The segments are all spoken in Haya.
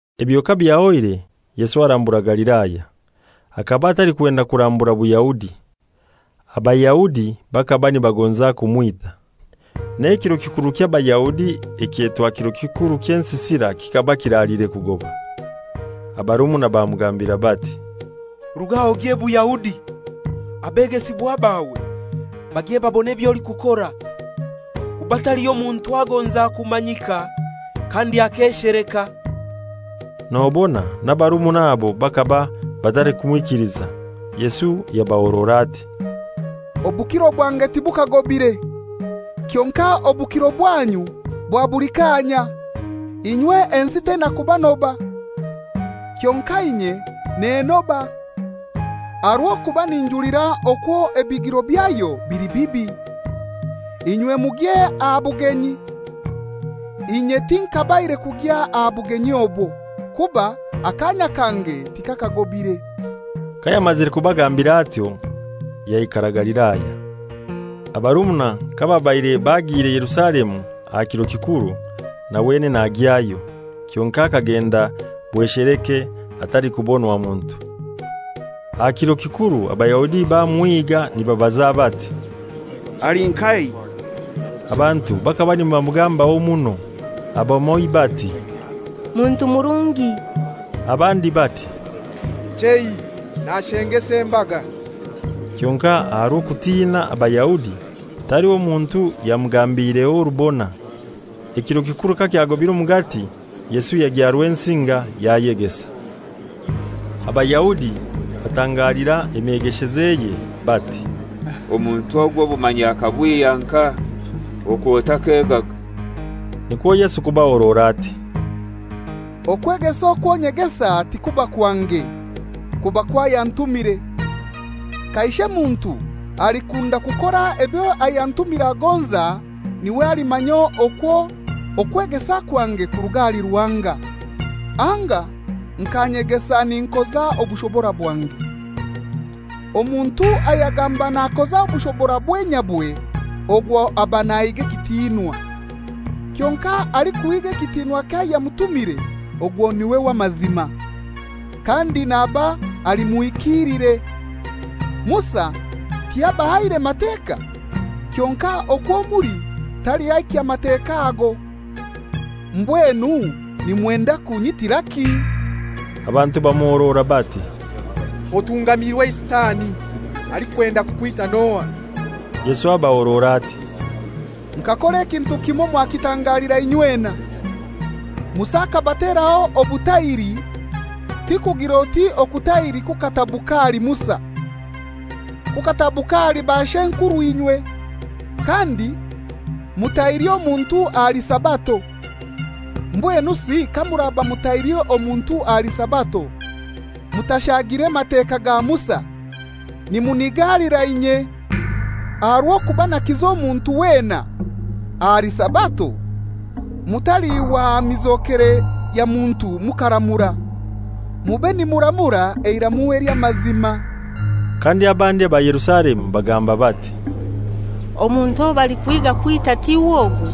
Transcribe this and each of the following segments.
Ebyo kabyahoire, Yesu arambura Galilaya. Hakaba atalikwenda kurambura Buyahudi. Abayahudi bakaba nibagonza kumwita. N'ekiro kikuru ky'Abayahudi ekyetwa Kiro kikuru ky'Ensisira kikaba kiraliire kugoba. Abarumuna bamugambira bati, «Ruga aha ogye Buyahudi, abegesibwa bawe bagye babone eby'olikukora. Kuba taliho muntu agonza kumanyika kandi akesheleka.» Nobona n'abarumuna abo bakaba batalikumwikiliza. Yesu yabahorora ati, «Obukiro bwange tibukagobire; kyonkai obukiro bwanyu bwa buli kaanya. Inywe ensi teina kubanoba, kyonkai inye nennoba, aha rw'okuba ninjulira okwo ebigiro byayo bili bibi. Inywe mugye aha bugenyi. Inye tinkabaire kugya aha bugenyi obwo, kuba akaanya kange tikakagobire.» Kayamazire kubagambira atyo yaikara Galilaya. Abarumuna kababaire bagiire Yerusalemu aha kiro kikuru, na wenene agyayo. Kyonkai akagenda bwesheleke atalikubonwa muntu. Aha kiro kikuru Abayahudi bamuhiga nibabaza bati, «Ali nkahai?» Abantu bakaba nibamugambaho muno; abamoi bati, «Muntu murungi;» abandi bati, «Chei, nashengesa embaga.» Kyonkai aha rw'okutina Abayahudi, taliho muntu yamugambiireho orubona. Ekiro kikuru kakyagobire omugati, Yesu yagya Rwensinga yayegesa. Abayahudi batangalira emyegeshezeye bati, «Omuntu ogu obumanyi akabwihya nkahai, okwo takegaga?» Nikwo Yesu kubahorora ati, «Okwegesa okwo nyegesa tikuba kwange, kuba kw'ayantumire. Kaishe muntu alikunda kukora ebyo ayantumire agonza n'iwe alimanya okwo okwegesa kwange kuruga ahali Ruhanga, anga nka nyegesa ninkoza obushobora bwange. Omuntu ayagamba nakoza obushobora obwe nyabwe ogwo aba nahiga ekitinwa. Kyonkai alikuhiga ekitinwa ky'ayamutumire ogwo n'iwe w'amazima, kandi naba ali muhikiilire. Musa tiyabahaire Mateka? Kyonkai okwo muli taliho ahikya Mateka ago. Mbwenu nimwenda kunyitiraki?» Abantu bamuhorora bati, «Otungamiirwe eisitani. Alikwenda kukwita n'ohai?» Yesu abahorora ati, «Nkakora ekintu kimoi mwakitangalira inywena. Musa hakabateraho okutahiri (ti kugir'oti okutahiri kukatabuka ahali Musa, kukatabuka ahali bashw'enkurw'inywe); kandi mutahiri omuntu ahali Sabato. Mbwenusi kamuraba mutahiri omuntu ahali Sabato mutashagire Mateka ga Musa, nimunigalira inye aha rw'okuba nakiza omuntu wena ahali Sabato? Mutaliihwa aha mizokere ya muntu mukaramura; mube nimuramura eiramu ely'amazima.» Kandi abandi aba Yerusalemu bagamba bati, «Omuntu owo balikuhiga kwita tiw'ogu?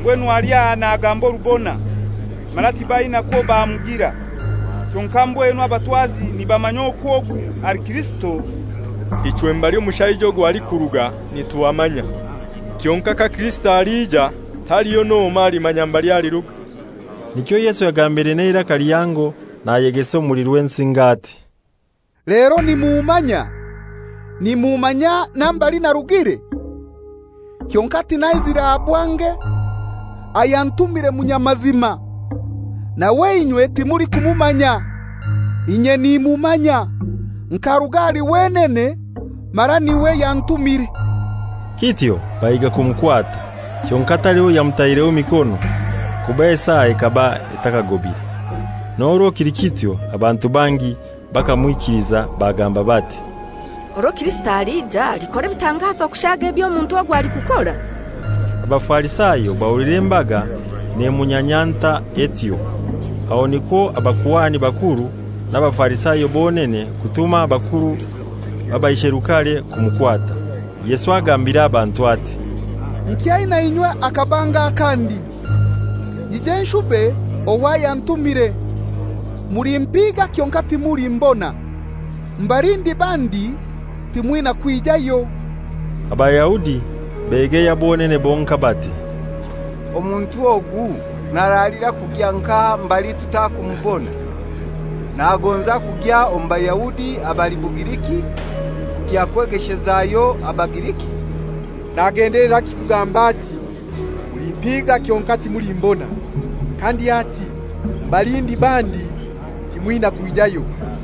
Mbwenu ali aha nagamba orubona, mara tibaina kwo bamugira! Kyonkai mbwenu abatwazi nibamanya okwo ogu ali Kirisito? Ichwe mbali omushaija ogu alikuruga nituhamanya. Kyonkai ka Kirisito alija taliho n'omoi alimanya mbali aliruga.» Nikyo Yesu yagambire n'eiraka lihango nayegesa omuli Rwensinga ati, «Lero nimummanya, nimummanya na mbali narugire? Kyonkai tinaizire aha bwange. Ayantumire munyamazima, nawe inywe timulikumumanya. Inye nimumanya; nkaruga ahali wenene, mara n'iwe yantumire.» Kityo bahiga kumukwata, kyonkai taliho yamutaireho mikono, kuba esaa ekaba etakagobire. N'orwo kili kityo abantu bangi bakamwikiliza, bagamba bati, «Orwo Kirisito alija alikora ebitangazo kushaaga eby'omuntu ogu alikukora?» Abafarisayo bahulira embaga nemunyanyanta etyo, aho nikwo abakuhani bakuru n'Abafarisayo bonene kutuma abakuru b'abaisherukare kumukwata. Yesu agambira abantu ati, «Nkyaina inywe hakabanga akandi, nyije nshube ow'ayantumire. Mulimpiga kyonkai timulimbona; mbali ndiba ndi timwina kwijayo.» Abayahudi begeya bonene bonkai bati, «Omuntu ogu naralira kugya nkahai mbali tutakumubona? Nagonza kugya omu Bayahudi abali Bugiriki kugya kwegeshezayo Abagiriki? Nagendeleraki kugamba ati, ‹Mulimpiga kyonkai timulimbona,› kandi ati, ‹Mbali ndiba ndi timwina kwijayo?›»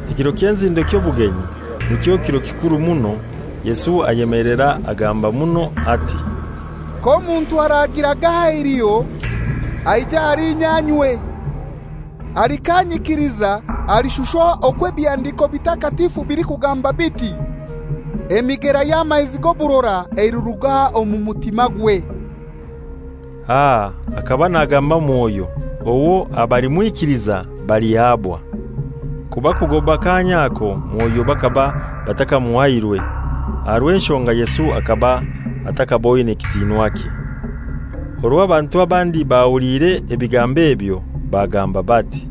Ekiro ky'enzindo ky'obugenyi, nikyo kiro kikuru muno, Yesu ayemelera agamba muno ati, «K'omuntu aragiraga eiliho, aije ahali inye anywe. Alikanyikiliza alishusha okwo ebihandiko bitakatifu bilikugamba biti, ‹Emigera y'amaizi g'oburora eliruga omu mutimagwe.›» Aha hakaba nagamba Mwoyo, owo abalimwikiliza balihabwa; kuba kugoba kaanya ako Mwoyo bakaba batakamuhairwe, aha rw'enshonga Yesu hakaba atakaboine kitinwakye. Orwo abantu abandi bahuliire ebigambo ebyo bagamba bati,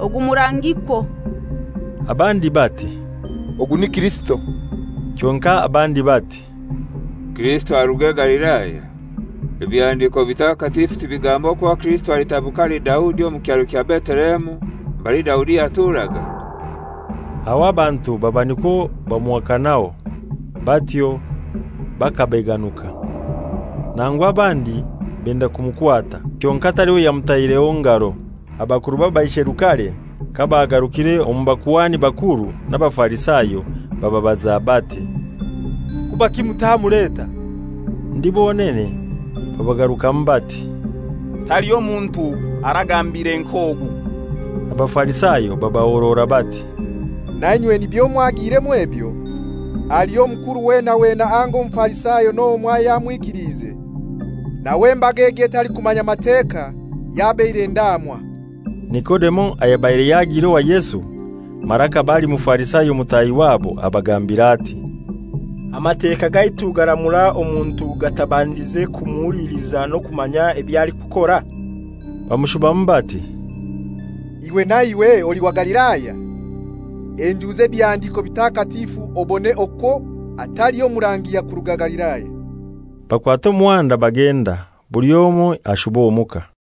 «Ogu murangikwo.» Abandi bati, «Ogu ni Kirisito.» Kyonkai abandi bati, «Kirisito aruge Galilaya? Ebihandiko bitakatifu tibigamba okwo Kirisito alitabuka ahali Daudi, omu kyaro kya Betelehemu, mbali Daudi yaturaga?» Aho abantu baba nikwo bamuhakanaho batyo bakabeganuka. Nangu abandi benda kumukwata, kyonkai taliho yamutaireho ngaro. Abakuru b'Abaisherukare kabagarukire omu bakuhani bakuru n'Abafarisayo, bababaza bati, «Kubaki mutamuleta?» Ndi bonene babagarukamu bati, «Taliho muntu aragambiire nk'ogu!» Abafarisayo babahorora bati, «Nainywe nibyo mwagiiremu ebyo? Haliho omukuru wena wena anga Omufarisayo n'omoi ayamwikiliize? Nawe embaga egi etalikumanya Mateka, yabaire ndaamwa.» Nikodemo ayabaire yagiire owa Yesu, mara hakaba ali Mufarisayo mutahi wabo, abagambira ati, «Amateka gaitu garamura omuntu gatabandize kumuhuliliza n'okumanya eby'alikukora?» Bamushubamu bati, «Iwe na iwe oli wa Galilaya? Henjuza Ebihandiko Bitakatifu obone okwo hataliho murangi yakuruga Galilaya.» [Bakwata omuhanda bagenda, buli omoi ashuba omuka.